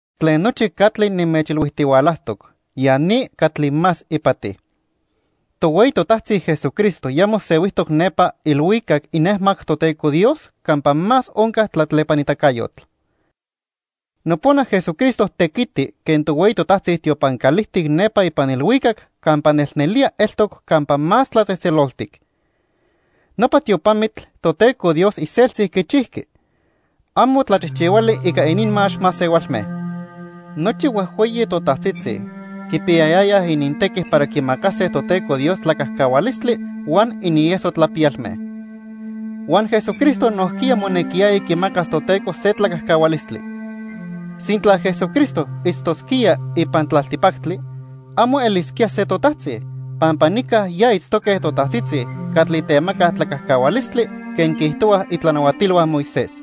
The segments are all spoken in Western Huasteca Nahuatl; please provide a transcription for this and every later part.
Tlen nochi catli nimechilhuijtihualajtoc, ya ni catli más ipati: Tohueyi totajtzi Jesucristo ya mosehuijtoc nepa ilhuicac inejmac Toteco Dios campa más onca tlatlepanitacayotl. Nopona Jesucristo tequiti quen tohueyi totajtzi tiopan calijtic nepa ipan ilhuicac campa nelnelía eltoc Campa Más Tlatzejtzeloltic. Nopa tiopamitl Toteco Dios iseltzi quichijqui. Amo tlachijchihuali ica ininmax masehualme. Nochi huejhueyi totajtzitzi quipiyayayaj inintequi para quimacase Toteco Dios tlacajcahualistli huan inieso tlapiyalme. Huan Jesucristo nojquiya monequiyaya quimacas Toteco se tlacajcahualistli. Sintla Jesucristo itztosquía ipan tlaltipactli, amo elisquía se totajtzi, pampa nica ya itztoque totajtzitzi catli temacaj tlacajcahualistli quen quiijtohuaj itlanahuatilhua Moisés.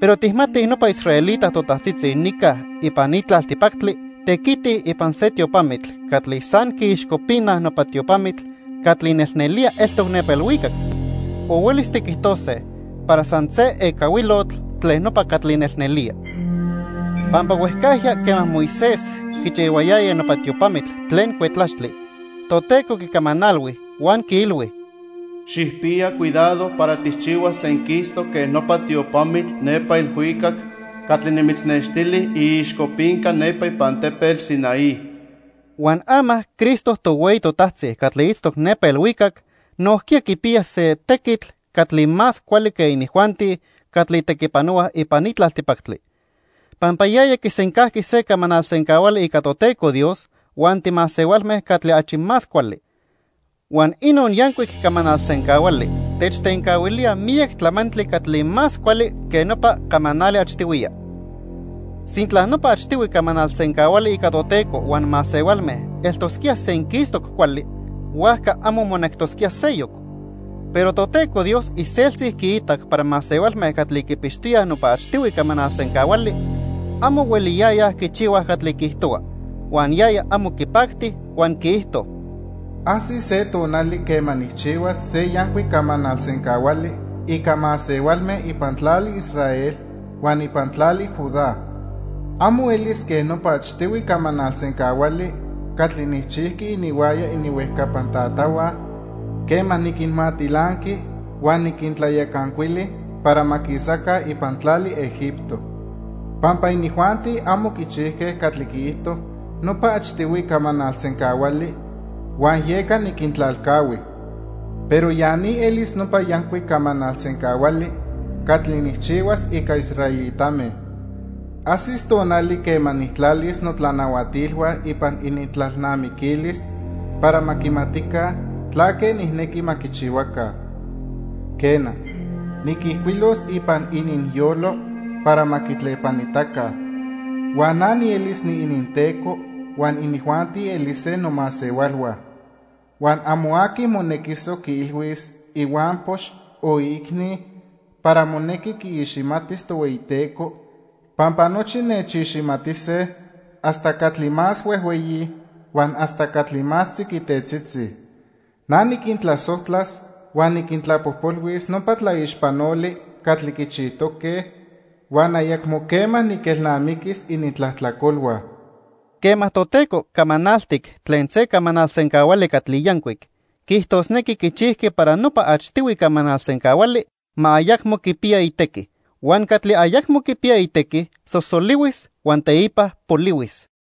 Pero tijmatij nopa israelita totajtzitzi nica ipan ni tlaltipactli tequitij ipan se tiopamitl catli san quiixcopinaj nopa tiopamitl catli nelnelía eltoc nepa ilhuicac, o huelis tiquijtose para san se ecahuilotl tlen nopa catli nelnelía. Pampa huejcajya quema Moisés quichihuayaya nopa tiopamitl tlen cuetlaxtli, Toteco quicamanalhui huan quiilhui: "Xijpiya cuidado para tijchihuas senquistoc quen nopa tiopamitl nepa ilhuicac catli nimitznextili iixcopinca nepa ipan tepetl Sinaí." Huan ama Cristo tohueyi totajtzi catli itztoc nepa ilhuicac nojquiya quipiya se tequitl catli más cuali que inijuanti catli tequipanohuaj ipan ni tlaltipactli, pampa yaya quisencajqui se camanal sencahuali ica Toteco Dios huan timasehualme catli achi más cuali. Huan inon yancuic camanal sencahuali techtencahuilía miyac tlamantli catli más cuali que nopa camanali achtihuiya. Sintla nopa achtihui camanal sencahuali ica Toteco huan masehualme eltosquía senquistoc cuali, huajca amo monectosquía seyoc. Pero Toteco Dios iseltzi quiitac para masehualme catli quipixtoyaj nopa achtihui camanal sencahuali, amo hueliyayaj quichihuaj catli quiijtohua, huan yaya amo quipacti huan quiijto: "Ajsis se tonali quema nijchihuas se yancuic camanal sencahuali ica masehualme ipan tlali Israel huan ipan tlali Judá. Amo elis quen nopa achtihui camanal sencahuali catli nijchijqui ininhuaya ininhuejcapan tatahua quema niquinmatilanqui huan niquintlayacancuili para ma quisaca ipan tlali Egipto. Pampa inijuanti amo quichijque catli quiijto nopa achtihui camanal sencahuali huan yeca niquintlalcahui. Pero ya ni elis nopa yancuic camanal sencahuali catli nijchihuas ica israelitame. Ajsis tonali quema nijtlalis notlanahuatilhua ipan inintlalnamiquilis para ma quimatica tlaque nijnequi ma quichihuaca. Quena, niquijcuilos ipan ininyolo para ma quitlepanitaca. Huan na nielis niininTeco huan inijuanti elise nomasehualhua. Huan amo aqui monequisoc quiilhuis ihuampox o iicni para monequi quiiximatis Tohueyiteco, pampa nochi nechiximatise hasta catli más huejhueyi huan hasta catli más tziquitetzitzi. Na niquintlasojtlas huan niquintlapojpolhuis nopa tlaixpanoli catli quichijtoque, huan ayacmo quema niquelnamiquis inintlajtlacolhua." Quema Toteco camanaltic tlen se camanal sencahuali catli yancuic, quiijtosnequi quichijqui para nopa achtihui camanal sencahuali ma ayacmo quipiya itequi. Huan catli ayacmo quipiya itequi sosolihuis huan teipa polihuis.